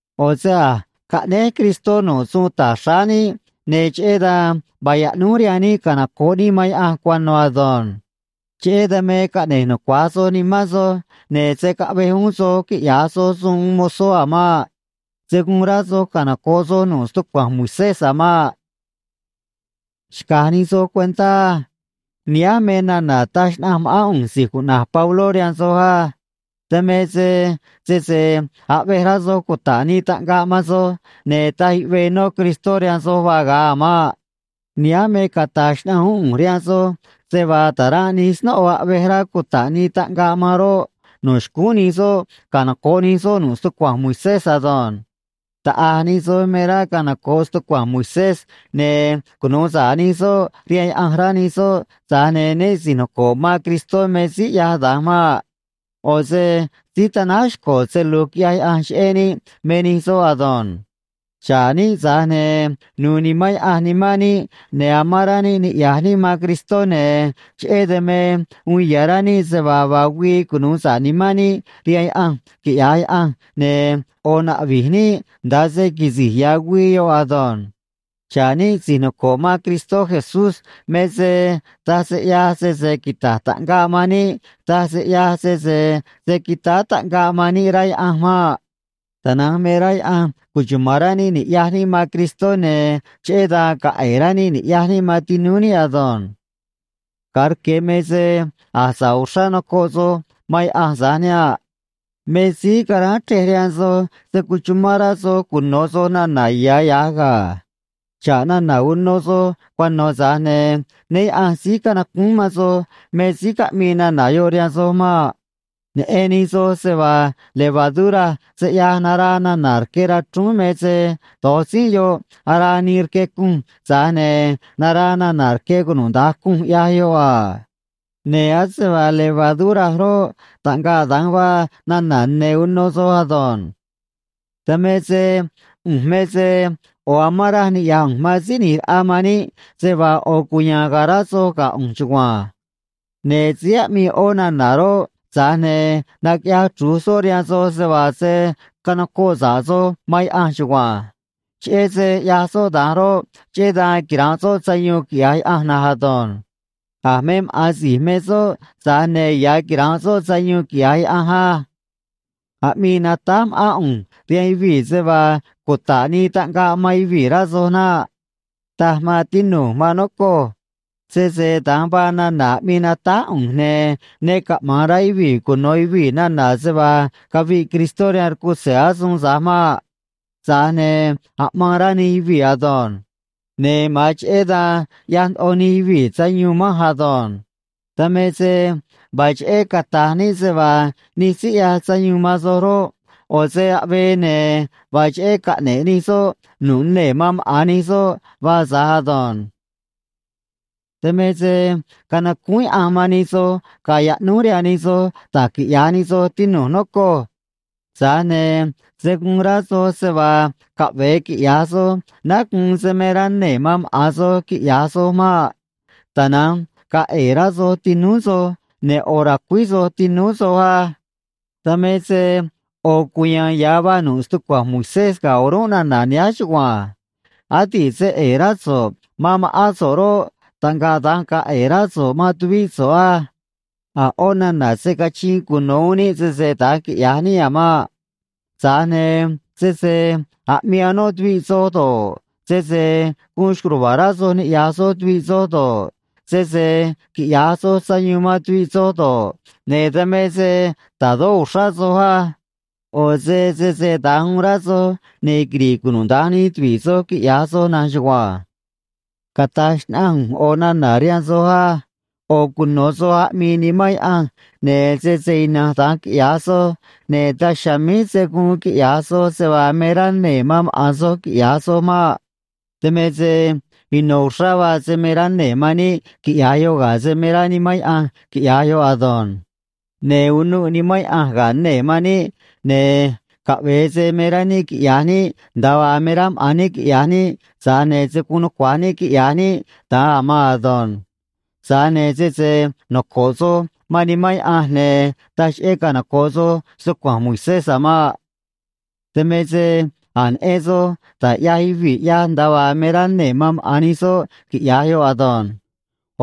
ꞌO̱ se a̱j caꞌnéj Cristó nu̱ꞌ suun ta̱j xráá níꞌ, ne̱ cheꞌé dan vaa yaꞌnúj rihaan níꞌ canoco̱ꞌ níꞌ man Yaꞌanj cuano̱ ado̱nj. Cheꞌé dan me caꞌne̱j nucuaj soj nimán soj, ne̱ se̱ caꞌvej uún soj quiꞌya̱j soj suun uun mozó a̱ maꞌ. Se̱ guun rá soj canoco̱ꞌ soj nu̱ꞌ stucua̱nj Moisés a̱ maꞌ. Xca̱j nij soj cuentá á. Nihánj me nana̱ taj xnaꞌanj ma̱ꞌán ꞌu̱nj si̱j cuꞌna̱j Pabló rihaan soj á. Dan me se sese aꞌvej rá soj cuta̱ꞌ nii taꞌngaꞌ man soj, ne̱ taj yuꞌvee nó Cristó rihaan soj vaa ga̱a a̱ maꞌ. Nihánj me cata̱j xnaꞌanj uún ꞌu̱nj rihaan soj se vaa ta̱ranꞌ nij snóꞌo aꞌvej rá cuta̱ꞌ nii taꞌngaꞌ man roꞌ, no̱ xcúún nij soꞌ canoco̱ꞌ nij soꞌ nu̱ꞌ stucua̱nj Moisés ado̱nj. Taꞌa̱j nij soj me rá canoco̱ꞌ stucua̱nj Moisés, ne̱ cunu̱u sa̱ꞌ nij soꞌ rihaan Yaꞌanj, rá nij soꞌ, tza̱j ne̱ né si̱j noco̱ꞌ man Cristó me síí ꞌyaj da̱nj maꞌ. ꞌO̱ se síí tanáj xco̱ se lu̱j quiꞌyaj Yaꞌanj cheꞌé níꞌ me nij soꞌ ado̱nj. Xa̱ꞌ níꞌ, tza̱j ne̱ nu̱u̱ Nimán Yaꞌanj nimán níꞌ, ne̱ amán rá níꞌ niꞌya̱j níꞌ man Cristó, ne̱ cheꞌé dan me uun ya̱ rá níꞌ se vaa vaa güii cunu̱u sa̱ꞌ nimán níꞌ rihaan Yaꞌanj, quiꞌya̱j Yaꞌanj, ne̱ ꞌo̱ naꞌvi̱j níꞌ nda̱a se quisi̱j ya̱ güii yoꞌ ado̱nj. Xa̱ꞌ níꞌ si̱j noco̱ꞌ man Cristó Jesús me se taj se ꞌyaj sese quita̱j taꞌngaꞌ man níꞌ, taj se ꞌyaj sese se̱ quitáá taꞌngaꞌ man níꞌ, rá Yaꞌanj maꞌ. Tana̱nj me rá Yaꞌanj cuchuma̱n rá níꞌ ni̱ꞌyaj níꞌ man Cristó, ne̱ cheꞌé dan ga̱a̱ ꞌe̱e̱ rá níꞌ ni̱ꞌyaj níꞌ man tinúú níꞌ ado̱nj. Ga̱a rque̱ me se a̱j sa̱ꞌ uxrá nocoꞌ soj man Yaꞌanj tza̱j niha̱nꞌ. Me síí caráán chrej rihaan soj se̱ cuchumán rá soj cuno̱ soj nana̱ ya̱ ya̱j ga̱. Xa̱ꞌ nana̱ uno soj cuano̱, tza̱j ne̱ né Yaꞌa̱nj síí canacúún man soj me síí caꞌmii nana̱ yoꞌ rihaan soj maꞌ. Neꞌen nij soj se vaa levadura se ꞌyaj naraa nana̱ rque rachrúún, me se do̱j tzínꞌ yoꞌ araa nii rque cunj, tza̱j ne̱ naraa nana̱ rque cunuda̱nj cunj, ꞌyaj yoꞌ a. Ne̱ ase vaa levadura roꞌ, taꞌngaꞌ da̱nj vaa nana̱ ne̱ uno soj ado̱nj. Dan me se ꞌu̱nj me se ꞌo̱ amán raj niꞌya̱j ꞌu̱nj man Síí ꞌNi̱j Raꞌa man níꞌ se vaa ꞌo̱ cuya̱a̱n ga̱a̱ rá soj ga̱ ꞌu̱nj chugua̱nj. Ne̱ síí aꞌmii ꞌó nana̱ roꞌ, tza̱j ne̱ naquiꞌyaj chru̱j soꞌ rihaan soj se vaa se̱ canocoꞌ sa̱ꞌ soj man Yaꞌanj chugua̱nj. Cheꞌé se ꞌyaj soꞌ da̱nj roꞌ, cheꞌé dan quira̱nꞌ soꞌ sayuun, quiꞌya̱j Yaꞌanj na̱nj ado̱nj. A̱ me maꞌa̱n si̱j me soꞌ, tza̱j ne̱ ya̱ quira̱nꞌ soꞌ sayuun, quiꞌya̱j Yaꞌanj á. Aꞌmii natáj ma̱ꞌán ꞌu̱nj rihaan yuvii̱ se vaa cuta̱ꞌ nii taꞌngaꞌ man yuvii̱, rá soj naꞌ. Taj, maan tinu̱j, maan nocoj. Sese da̱nj vaa nana̱ aꞌmii natáj ꞌu̱nj, ne̱ ne caꞌma̱an rá yuvii̱ cuno̱ yuvii̱ nana̱ se vaa caviꞌ Cristó rihaan rcutze̱ asuun tza̱j maꞌ. Tza̱j ne̱ aꞌmaan rá nij yuvii̱ ado̱nj. Ne̱ ma̱an cheꞌé dan ꞌyaj ndoꞌo nij yuvii̱ sayuun manj ado̱nj. Dan me se vaa cheꞌé cata̱j níꞌ se vaa nij síí ꞌyaj sayuun man soj roꞌ, ꞌo̱ se aꞌvee, ne̱ vaa cheꞌé caꞌne̱ꞌ nij soꞌ nu̱ꞌ nee̱ man maꞌa̱n nij soꞌ vaa tza̱j ado̱nj. Dan me se canacúún Yaꞌanj man nij soj ga̱a̱ yaꞌnúj rihaan nij soj da̱j quiꞌya̱j nij soj, tinu̱j, nocoj. Tza̱j ne̱ se̱ guun rá soj se vaa caꞌve̱e quiꞌya̱j soj náá guun se me rá nee̱ man maꞌa̱n soj quiꞌya̱j soj maꞌ. Tana̱nj ga̱a̱ ꞌe̱e̱ rá soj tinúú soj, ne̱ ꞌo̱ ra̱cuíj soj tinúú soj á. Dan me se ꞌo̱ cuya̱a̱n ya̱ vaa nu̱ꞌ stucua̱nj Moisés ga̱ o̱rúnꞌ nana̱ nihánj chugua̱nj: “Adi̱ꞌ se ꞌe̱e̱ rá so̱ꞌ man ma̱ꞌán so̱ꞌ roꞌ, taꞌngaꞌ da̱nj ga̱a̱ ꞌe̱e̱ rá so̱ꞌ man tuvíꞌ so̱ꞌ á.” A̱ ꞌó nana̱ se̱ cachiin cuno̱ uún níꞌ, sese da̱nj quiꞌya̱j níꞌ a̱ maꞌ. Tza̱j ne̱ sese aꞌmii anó tuviꞌ soj do̱ꞌ, sese gu̱un xco̱j ruva̱a̱ rá soj ni̱ꞌyaj soj tuviꞌ soj do̱ꞌ, sese quiꞌya̱j soj sayuun man tuviꞌ soj do̱ꞌ, ne̱ dan me se ta̱dó uxrá soj á. ꞌO̱ se sese da̱nj uun rá soj, ne̱ quiri̱ꞌ cunuda̱nj nij tuvi̱ꞌ soj, quiꞌya̱j soj na̱nj chugua̱nj. Cata̱j xnaꞌanj ꞌu̱nj ꞌo̱ nana̱ rihaan soj á: ꞌO̱ cuno̱ soj aꞌmii Nimán Yaꞌanj, ne̱ sese ina̱nj da̱nj quiꞌya̱j soj, ne̱ daj chiha̱a̱ míj se̱ guun quiꞌya̱j soj se vaa me rá nee̱ man maꞌa̱n soj quiꞌya̱j soj maꞌ. Dan me se ino̱ uxrá vaa se me rá nee̱ man níꞌ quiꞌya̱j yoꞌ ga̱ se me rá Nimán Yaꞌanj quiꞌya̱j yoꞌ ado̱nj. Ne̱ unuꞌ Nimán Yaꞌanj ga̱ nee̱ man níꞌ, ne̱ caꞌve̱e se me rá níꞌ quiꞌya̱j níꞌ nda̱a vaa me rá maꞌa̱n níꞌ quiꞌya̱j níꞌ, tza̱j ne̱ se̱ guun nucua̱j níꞌ quiꞌya̱j níꞌ da̱nj a̱ maan ado̱nj. Tza̱j ne̱ sese noco̱ꞌ soj man Nimán Yaꞌanj, ne̱ taj cheꞌé canoco̱ꞌ soj stucua̱nj Moisés a̱ maꞌ. Dan me se a̱j neꞌen soj da̱j ꞌyaj yuvii̱ ꞌyaj nda̱a vaa me rá nee̱ man maꞌa̱n nij soꞌ quiꞌya̱j yoꞌ ado̱nj.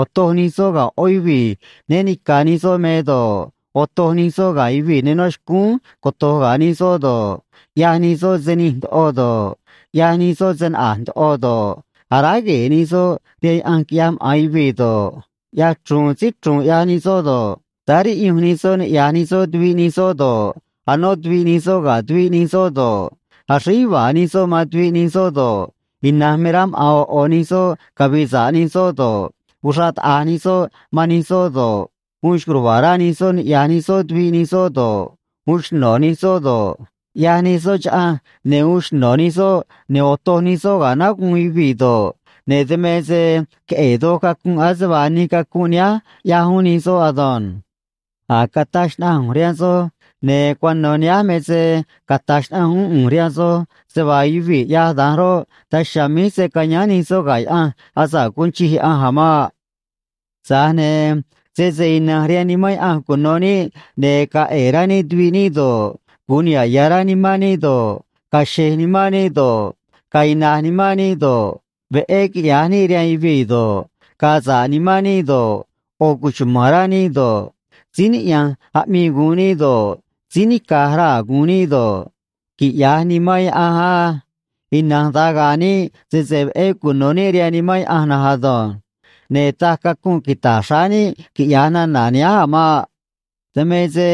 Otoj nij soꞌ ga̱ ꞌó yuvii̱ né ni̱ca̱ nij soꞌ me do̱ꞌ, otoj nij soꞌ ga̱ yuvii̱ ne nó xcúún coto̱j ga̱ nij soꞌ do̱ꞌ, ꞌyaj nij soꞌ se nij ndoꞌo do̱ꞌ, ꞌyaj nij soꞌ se naꞌa̱j ndoꞌo do̱ꞌ, aráj gue̱e̱ nij soꞌ rihaan yaꞌanj quiꞌyaj maꞌa̱n yuvii̱ do̱ꞌ, ꞌyaj chru̱u̱n síí chru̱u̱n ꞌyaj nij soꞌ do̱ꞌ, táá riꞌyunj nij soꞌ niꞌya̱j nij soꞌ tuviꞌ nij soꞌ do̱ꞌ, anó tuviꞌ nij soꞌ ga̱ tuviꞌ nij soꞌ do̱ꞌ, axríj yuva̱a̱ nij soꞌ man tuviꞌ nij soꞌ do̱ꞌ, ina̱nj me rá maꞌa̱n ꞌo̱ ꞌo̱ nij soꞌ cavi̱i̱ sa̱ꞌ nij soꞌ do̱ꞌ, uxraꞌ taꞌa̱j nij soꞌ man nij soꞌ do̱ꞌ, uun xco̱j ruva̱a̱ rá nij soꞌ niꞌya̱j nij soꞌ tuviꞌ nij soꞌ do̱ꞌ, uun xno̱ nij soꞌ do̱ꞌ, ꞌyaj nij soꞌ chaꞌanj ne̱ uun xno̱ nij soꞌ ne̱ otoj nij soꞌ ga̱ náguun yuvii̱ do̱ꞌ, ne̱ dan me se queꞌe̱e̱ doj cacunꞌ ase vaa nij cacunꞌ nihánj ꞌyaj uún nij soꞌ ado̱nj. A̱j cataj xnaꞌanj ꞌu̱nj rihaan soj, ne̱ cuano̱ nihánj me se cata̱j xnaꞌanj uún ꞌu̱nj rihaan soj se vaa yuvii̱ ꞌyaj da̱nj roꞌ, daj chiha̱a̱ míj se̱ cayáán nij soꞌ ga̱ Yaꞌanj asa̱ꞌ guun chij Yaꞌanj a̱ maꞌ. Tza̱j ne̱ sese ina̱nj rihaan Nimán Yaꞌanj cuno̱ níꞌ, ne̱ ga̱a̱ ꞌe̱e̱ rá níꞌ tuviꞌ níꞌ do̱ꞌ, gu̱un niha̱ꞌ ya̱ rá nimán níꞌ do̱ꞌ, ga̱a̱ xe̱j nimán níꞌ do̱ꞌ, ga̱a̱ ina̱j nimán níꞌ do̱ꞌ, veꞌé quiꞌya̱j níꞌ rihaan yuvii̱ do̱ꞌ, ga̱a̱ sa̱ꞌ nimán níꞌ do̱ꞌ, ꞌo̱ cuchuma̱n rá níꞌ do̱ꞌ, síí niꞌya̱nj aꞌmii gu̱un níꞌ do̱ꞌ, síí nica̱j raa̱ gu̱un níꞌ do̱ꞌ, quiꞌya̱j Nimán Yaꞌanj á. Ina̱nj da̱nj ga̱a̱ níꞌ sese veꞌé cuno̱ níꞌ rihaan Nimán Yaꞌanj na̱nj ado̱nj. Ne̱ taj cacunꞌ quita̱j xráá níꞌ quiꞌya̱j nana̱ nihánj a̱ maꞌ. Dan me se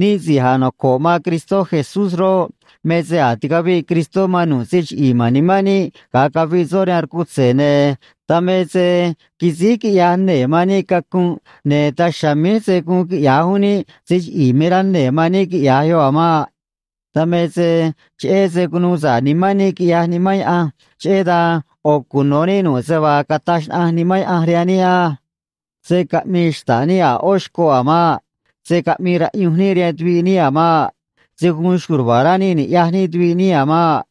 níꞌ si̱j a̱j noco̱ꞌ man Cristó Jesús roꞌ, me se a̱j ticaviꞌ Cristó man nu̱ꞌ se chiꞌi̱i̱ ma̱n nimán níꞌ, ga̱a caviꞌ soꞌ rihaan rcutze̱, ne̱ dan me se quisíj quiꞌyaj nee̱ man níꞌ cacunꞌ, ne̱ daj chiha̱a̱ míj se̱ guun quiꞌya̱j uún níꞌ se chiꞌi̱i̱ me rá nee̱ man níꞌ quiꞌya̱j yoꞌ a̱ maꞌ. Dan me se cheꞌé se cunuu sa̱ꞌ nimán níꞌ, quiꞌyaj Nimán Yaꞌanj, cheꞌé dan ꞌo̱ cuno̱ níꞌ nu̱ꞌ se vaa cata̱j xnaꞌanj Nimán Yaꞌanj rihaan níꞌ á. Se̱ caꞌmii xta̱ꞌ níꞌ a̱ ꞌó xcoꞌ a̱ maꞌ. Se̱ caꞌmii raꞌyunj níꞌ rihaan tuviꞌ níꞌ a̱ maꞌ. Se̱ guun xco̱j ruva̱a̱ rá níꞌ ni̱ꞌyaj níꞌ tuviꞌ níꞌ a̱ maꞌ.